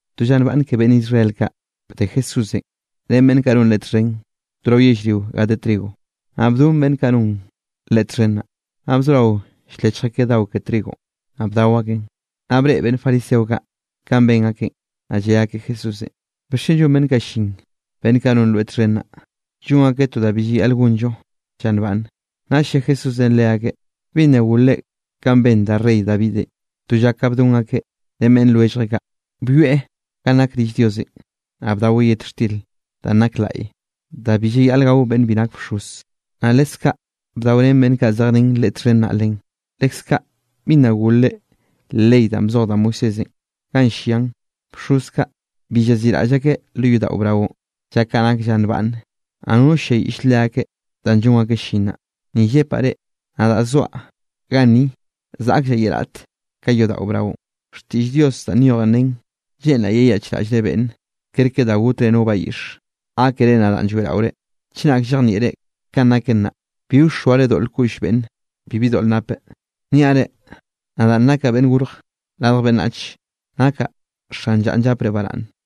To lla nbaꞌnn ke beꞌnn Israel kaꞌ bde Jesúsenꞌ ren beꞌnn kaꞌ non Leꞌe txhen to rao yellrio ga de trigo. Naꞌ bdon beꞌnn kaꞌ non Leꞌe txhen naꞌ, naꞌ bzorao ll-lechj akeꞌ dao ke trigonꞌ, naꞌ bdao akeꞌn. Naꞌ breꞌe beꞌnn fariseo kaꞌ kanꞌ ben akeꞌn, naꞌ lle akeꞌ Jesúsenꞌ: —¿Bixchen llon beꞌnn kaꞌ llin, beꞌnn kaꞌ non rweꞌ txhen naꞌ, llon akeꞌ to da bi llayaꞌl gonllo lla nbaꞌnne? Naꞌll lle Jesúsenꞌ leakeꞌ: —¿Bi nna golre kanꞌ ben da rey Davidenꞌ to lla ka bdon akeꞌ ren beꞌnn lwelljeꞌ kaꞌ? Byoeꞌ ganꞌ nak rill Diosenꞌ, naꞌ bdaweꞌ yet xtir danꞌ nak laꞌy da bi llayaꞌl gao beꞌnn bi nak bxoz, naꞌ leskaꞌ bdaorén beꞌnn kaꞌ zej ren Leꞌe txhen naꞌ len. ¿Leskaꞌ bi nna golre leꞌ ley danꞌ bzoj da Moisésenꞌ ganꞌ llian, bxoz kaꞌ bi llaziꞌraꞌll akeꞌ lo yodaꞌo braonꞌ lla kaꞌ nak lla nbaꞌnne? Naꞌ nono ll-lliayiꞌll leakeꞌ danꞌ llon akeꞌ llin naꞌ. Ni llepaꞌ reꞌ, nadaꞌ zoaꞌ ganni zaꞌkllaꞌ ye raꞌt ka yodaꞌo braonꞌ. Xtiꞌll Dios danꞌ nyoj nen: “Lleꞌnraꞌ yeyaꞌchraꞌllre beꞌnne kerke da gotzre no bayiꞌx, gákere nadaꞌn lloeꞌraore.” Chenak llejnieꞌre kanꞌ naken naꞌ, bi wxoare doꞌl koꞌll beꞌnn bibi doꞌl nape. Niaꞌ reꞌ, nadaꞌn nakaꞌ Beꞌnn Gorj Radj Beꞌnnach, nakaꞌ xan llanꞌ llapre baraꞌnne.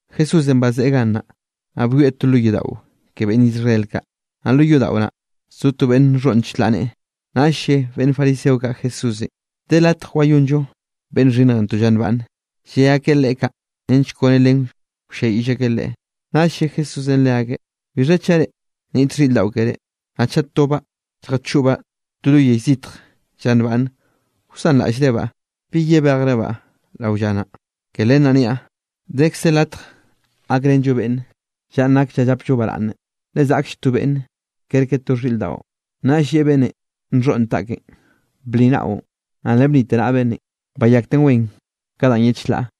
Jesúsenꞌ bazeꞌe gannaꞌ, naꞌ byoeꞌ to lo yodaꞌo ke beꞌnn Israel kaꞌ. Naꞌ lo yodaꞌo naꞌ, zo to beꞌnn nxhoꞌn chlaꞌ neꞌe, naꞌll lle beꞌnn fariseo kaꞌ Jesúsenꞌ: —¿De latj wayonllo beꞌnn xhinnj to lla nbaꞌnne? Lle akeꞌ Leꞌe kaꞌ nench kone len wlliayiꞌll akeꞌ Leꞌe. Naꞌll lle Jesúsenꞌ leakeꞌ: —Bixha chaꞌ reꞌ nniꞌt xhiꞌr daꞌo keré, naꞌ chaꞌ tobaꞌ lljachoꞌbaꞌ to lo yell zitj lla nbaꞌnne, ¿wsanraꞌllrebaꞌ, bi yebejrebaꞌ rao lla naꞌ? Ke len naꞌ niaꞌ, dekze latj gakrenllo beꞌnne, llanꞌ nak lla llapllo baraꞌnne, le zaꞌklle to beꞌnne kerke to xhiꞌr daꞌo. Naꞌll lleꞌe beꞌnnenꞌ nxhoꞌn taꞌkeꞌn: —Bli naꞌon. Naꞌ le blite naꞌa beꞌnnenꞌ, bayakten wen ka danꞌ ye chlaꞌ.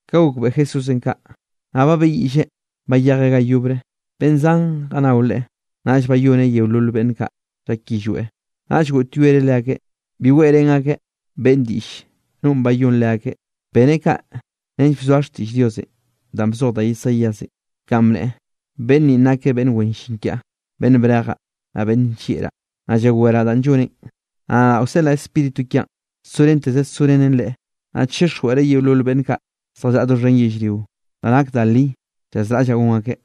Ka gokbeꞌe Jesúsenꞌ kaꞌ, naꞌ babeꞌyiꞌlleꞌ bayejeꞌ ga yobre. Beꞌnn zan jannao Leꞌe, naꞌll bayoneꞌ yeolol beꞌnn kaꞌ llak yillweꞌ. Naꞌll goꞌtyoereꞌ leakeꞌ, bi weꞌrén akeꞌ beꞌnn diꞌll nonꞌ bayón leakeꞌ. Beneꞌ kaꞌ nench bzoa xtiꞌll Diosenꞌ danꞌ bzoj da Isaíasenꞌ, kanꞌ bneꞌe: Beꞌnn ninꞌ nakeꞌ beꞌnn wen llin kiaꞌ, beꞌnn brejaꞌ, naꞌ beꞌnn nllieꞌraꞌ. Naꞌ llaweraꞌ danꞌ lloneꞌn. Naꞌ nadaꞌ wseꞌlaꞌ Spíritu kiaꞌn sorenteze sorenen Leꞌe. Naꞌ chixjweꞌreꞌ yeolol beꞌnn kaꞌ zjallaꞌa doxhen yellrio da nak da li llazraꞌllaꞌ gon akeꞌ.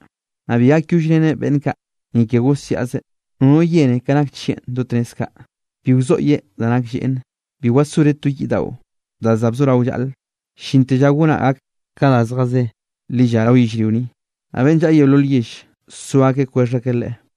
Naꞌ bi gakyollreneꞌ beꞌnn kaꞌ, ni ke gosiaꞌzeꞌ, nono yene ka nak chieꞌ do tnez kaꞌ. Bi wzoꞌye da nak lleꞌne. Bi wasoreꞌ to yiꞌ daꞌo, da za bzorao llaꞌle, llinte lla goneꞌ gak kon ka da zjazé lilla rao yellrio ni. Naꞌ beꞌnn llaꞌa yeolol yell, so akeꞌ kwexh akeꞌ Leꞌe.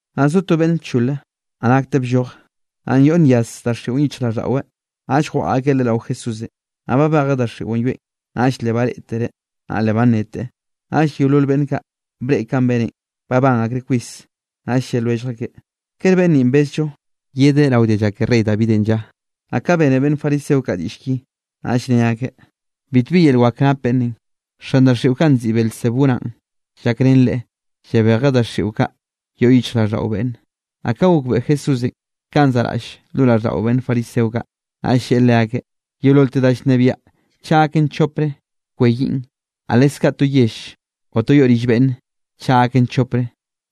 Naꞌ zo to beꞌnne lchole, naꞌ nakteꞌ blloje, yoꞌnyaz daxiꞌo yichjraꞌlldaꞌweꞌ, naꞌll jwaꞌa akeꞌ leꞌe rao Jesúsenꞌ. Naꞌ babejeꞌ daxiꞌon yoeꞌn, naꞌll le bareꞌtereꞌ, naꞌ le banneteꞌ. Naꞌll yeolol beꞌnn kaꞌ breꞌe kanꞌ beneꞌn, babán akreꞌ kwis. Naꞌll lle lwellj akeꞌ: —¿Kere beꞌnn ninꞌ bezllo yedeꞌ rao dialla ke rey Davidenꞌ lla? Naꞌ ka bene beꞌnn fariseo kaꞌ diꞌll ki, naꞌll ne akeꞌ: —Bitbi yel wak nap beꞌnnenꞌ. Xan daxiꞌo kaꞌ nziꞌi Beelzebú naꞌn llakrén leꞌe, llabejeꞌ daxiꞌo kaꞌ yoꞌ yichjraꞌlldaꞌo beꞌnne. Naꞌ ka gokbeꞌe Jesúsenꞌ kanꞌ zaꞌraꞌll lo raꞌlldaꞌo beꞌnn fariseo kaꞌ, naꞌll lleꞌe leakeꞌ: —Yeololte da llnebiaꞌ chaꞌ gaken chopre, kweyiꞌn, naꞌ leskaꞌ to yell o to yoꞌ rill beꞌnnenꞌ, chaꞌ gaken chopre,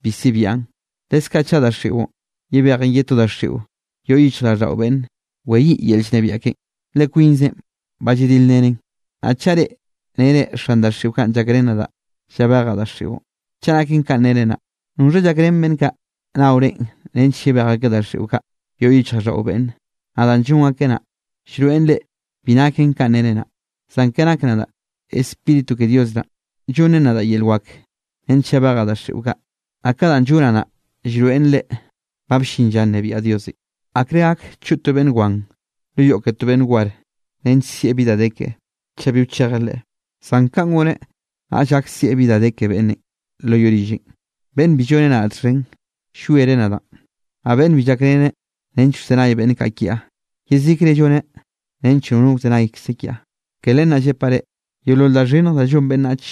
bi sibian. Leskaꞌ chaꞌ daxiꞌon yebejen ye to daxiꞌo yoꞌ yichjraꞌlldaꞌo beꞌnne, weyiꞌ yel llnebiaꞌ ken, le kwinzen ba lladilrenen. Naꞌ chaꞌ reꞌ nere xan daxiꞌo kaꞌ llakrén nadaꞌ llabejaꞌ daxiꞌon, chaꞌ naken kanꞌ nere naꞌ, ¿noxha llakrén beꞌnn kaꞌ nao reꞌn nench yebej akeꞌ daxiꞌo kaꞌ yoꞌ yichjraꞌlldaꞌo beꞌnne? Naꞌ danꞌ llon akeꞌ naꞌ, llroeꞌn reꞌ bi naken kanꞌ nere naꞌ. Zan ke nak nadaꞌ, Spíritu ke Dios naꞌn llonnen nadaꞌ yel wak nench llabejaꞌ daxiꞌo kaꞌ, naꞌ ka danꞌ llonaꞌ naꞌ, llroeꞌn reꞌ ba bllin lla nnebiaꞌ Diosenꞌ. ’¿Akre gak choꞌ to beꞌnn wan lo yoꞌ ke to beꞌnn war nench sieꞌ bi da de keꞌe, chaꞌ bi wchejeꞌ leꞌe? Zan kaꞌn goneꞌ, naꞌll gak sieꞌ bi da de ke beꞌnnenꞌ lo yoꞌ rilleꞌn. ’Beꞌnn bi lloneꞌ nadaꞌ txhen, llwiereꞌ nadaꞌn. Naꞌ beꞌnn bi llakreneꞌ nench wzenay beꞌnn kaꞌ kiaꞌ, yezikre lloneꞌ nench nono wzenaykze kiaꞌ. ’Ke len naꞌ llepaꞌ reꞌ, yeolol da xhinnj da llon beꞌnnach,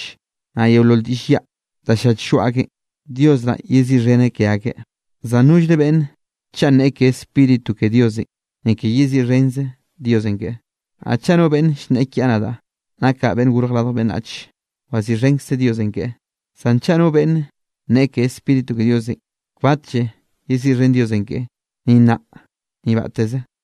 naꞌ yeolol diꞌll yaꞌ, danꞌ llach lloaꞌ akeꞌn, Dios naꞌ yeziꞌxheneꞌ ke akeꞌ, zan nollre beꞌnne, chaꞌ nneꞌe ke Spíritu ke Diosenꞌ, ni ke yeziꞌxhenze Diosenꞌ keꞌe. Naꞌ chaꞌ no beꞌnne llnneꞌe kiaꞌ nadaꞌ, nakaꞌ Beꞌnn Gorj Radj Beꞌnnach, waziꞌxhenkze Diosenꞌ keꞌe; zan chaꞌ no beꞌnne nneꞌe ke Spíritu ke Diosenꞌ, kbatlle yeziꞌxhen Diosenꞌ keꞌe, ni nnaꞌ ni batteze.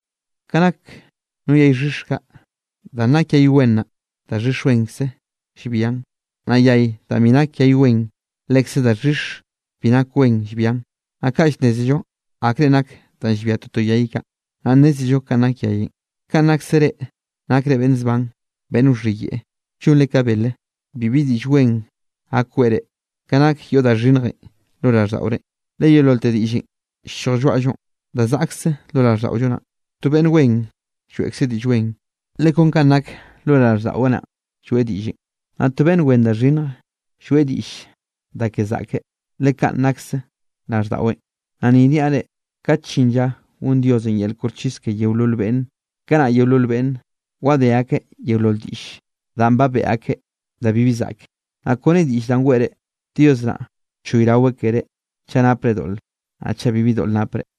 ’Ka nak no yay xhix kaꞌ, danꞌ nak yay wen naꞌ, daxhix wenkze llbian, naꞌ yay danꞌ bi nak yay wen lekze daxhix bi nak wen llbian. Naꞌ kaꞌ llnnézello akrenꞌ nake danꞌ llbia toto yay kaꞌ, naꞌ llnnézello kanꞌ nak yayenꞌ. ¡Kanꞌ nakse reꞌ, nakre beꞌnn zban, beꞌnn wxhiyeꞌe, llonre ka bele! Bibi diꞌll wen gak weꞌre ka nak yoꞌ da xhinnjenꞌ lo raꞌlldaꞌore. Le yeololte diꞌllenꞌ ll-lloj lloaꞌllonꞌ da zaꞌkze lo raꞌlldaꞌollo naꞌn. To beꞌnn wen lloeꞌkzeꞌ diꞌll wen, le kon kanꞌ nake lo raꞌlldaꞌweꞌ naꞌn lloeꞌ diꞌllenꞌ; naꞌ to beꞌnn wen da xhinnj lloeꞌ diꞌll da ke zaꞌke, le kaꞌn nakse raꞌlldaꞌweꞌn. Naꞌ ni niaꞌ reꞌ, kate llin lla gon Diosenꞌ yel koxchis ke yeolol beꞌnne, kanaꞌ yeolol beꞌnne wadé akeꞌ yeolol diꞌll danꞌ ba beꞌe akeꞌ da bibi zaꞌke. Naꞌ kone diꞌll danꞌ weꞌre, Dios naꞌ choyraweꞌ keré chaꞌ napre doꞌle, naꞌ chaꞌ bibi doꞌl napre.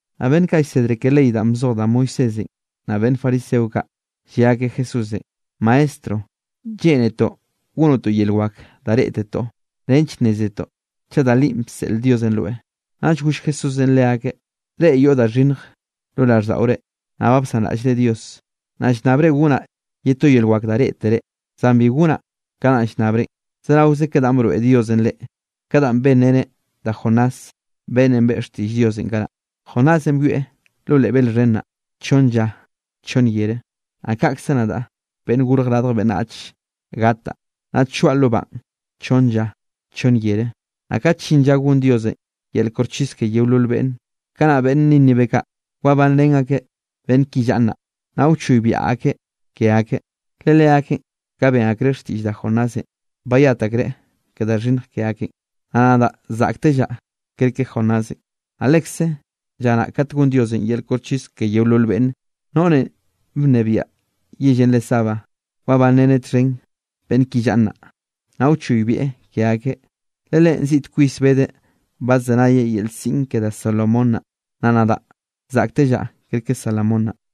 Naꞌ beꞌnn kaꞌ llsedre ke ley danꞌ bzoj da Moisésenꞌ, naꞌ beꞌnn fariseo kaꞌ lle akeꞌ Jesúsenꞌ: —Maestro, lleꞌnetoꞌ gonoꞌ to yel wak da reꞌtetoꞌ nench nnézetoꞌ chaꞌ da linꞌ bseꞌl Diosenꞌ rweꞌ. Naꞌll goll Jesúsenꞌ leakeꞌ: —Reꞌ yoꞌ da xhinnj lo raꞌlldaꞌore, naꞌ ba bsanraꞌllre Dios. Naꞌ llnnabre gonaꞌ ye to yel wak da reꞌtere, zan bi gonaꞌ ka danꞌ llnnabrenꞌ, zeraoze ka danꞌ broeꞌ Diosenꞌ reꞌ, ka danꞌ benreneꞌ da Jonás, beꞌnnenꞌ beꞌe xtiꞌll Diosenꞌ kanaꞌ. Jonásenꞌ byoeꞌ lo leꞌ bel xhen naꞌ chonn lla chonn yere. Naꞌ kaꞌkze nadaꞌ, Beꞌnn Gorj Radj Beꞌnnach gataꞌ, naꞌ choaꞌ lo banꞌ chonn lla chonn yere. Naꞌ kat llin lla gon Diosenꞌ yel koxchis ke yeolol beꞌnne, kanaꞌ beꞌnn Nínive kaꞌ wabanrén akeꞌ beꞌnn ki llaꞌa nnaꞌ, naꞌ wchoybiaꞌ akeꞌ ke akeꞌ, le leakeꞌn, ka ben akreꞌ xtiꞌll da Jonásenꞌ, bayat akreꞌ ke da xhinnj ke akeꞌn, naꞌ nadaꞌ zaꞌktellaꞌ kerke Jonásenꞌ. Naꞌ lekze lla naꞌ kat gon Diosenꞌ yel koxchis ke yeolol beꞌnne, noꞌrenꞌ bnebiaꞌ yellenꞌ re Sabá, wabanreneꞌ txhen beꞌnn ki llaꞌa nnaꞌ, naꞌ wchoybieꞌ ke akeꞌ, le leꞌen ziꞌt kwis bedeꞌ badzenayeꞌ yel siꞌn ke da Salomón naꞌ, naꞌ nadaꞌ zaꞌktellaꞌ kerke Salomón naꞌ.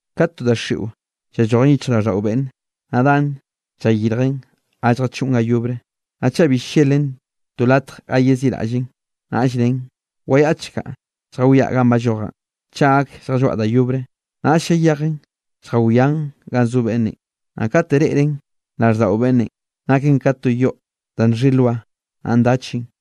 ’Kate to daxiꞌo llallojen yichjraꞌlldaꞌo beꞌnnenꞌ, naꞌ dan llayirjen ga lljachoꞌn ga yobre. Naꞌ chaꞌ bi ll-llelen to latj ga yeziꞌraꞌllen, naꞌll nnen: “Wayaꞌchkaꞌ lljawiaꞌ ganꞌ ballojaꞌn, chaꞌ gak lljalloaꞌ da yobre.” Naꞌll llayejen lljawian ganꞌ zo beꞌnnenꞌ, naꞌ kate reꞌren raꞌlldaꞌo beꞌnnenꞌ, naken ka to yoꞌ da nxhi nloa, naꞌ ndachen.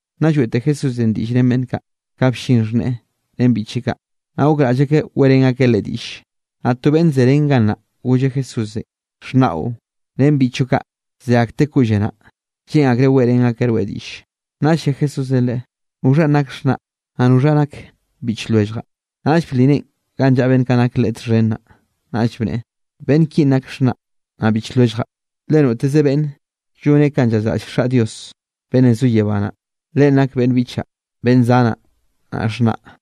Nna lloeꞌte Jesúsenꞌ diꞌll ren beꞌnn kaꞌ, ka bllin xhneꞌe ren biꞌcheꞌ kaꞌ, naꞌ gokraꞌll akeꞌ weꞌrén akeꞌ Leꞌe diꞌlle. Naꞌ to beꞌnn ze ren gannaꞌ golleꞌ Jesúsenꞌ: —Xhnaꞌo ren beꞌnn biꞌchoꞌ kaꞌ ze akteꞌ koꞌlle naꞌ, lleꞌn akreꞌ weꞌrén akeꞌ rweꞌ diꞌlle. Naꞌll lle Jesúsenꞌ leꞌe: —¿Noxhanꞌ nak xhnaꞌ, naꞌ noxha nak biꞌch lwelljaꞌ? Naꞌll bli neꞌen ganꞌ llaꞌa beꞌnn kaꞌ nak Leꞌe txhen naꞌ, naꞌll bneꞌe: —Beꞌnn kinꞌ nak xhnaꞌ, naꞌ biꞌch lwelljaꞌ. Le noteze beꞌnne llone kanꞌ llazraꞌll Xaꞌ Dios beꞌnnenꞌ zo yebá naꞌ, leꞌen nak beꞌnn biꞌchaꞌ, beꞌnn zanaꞌ naꞌ xhnaꞌ.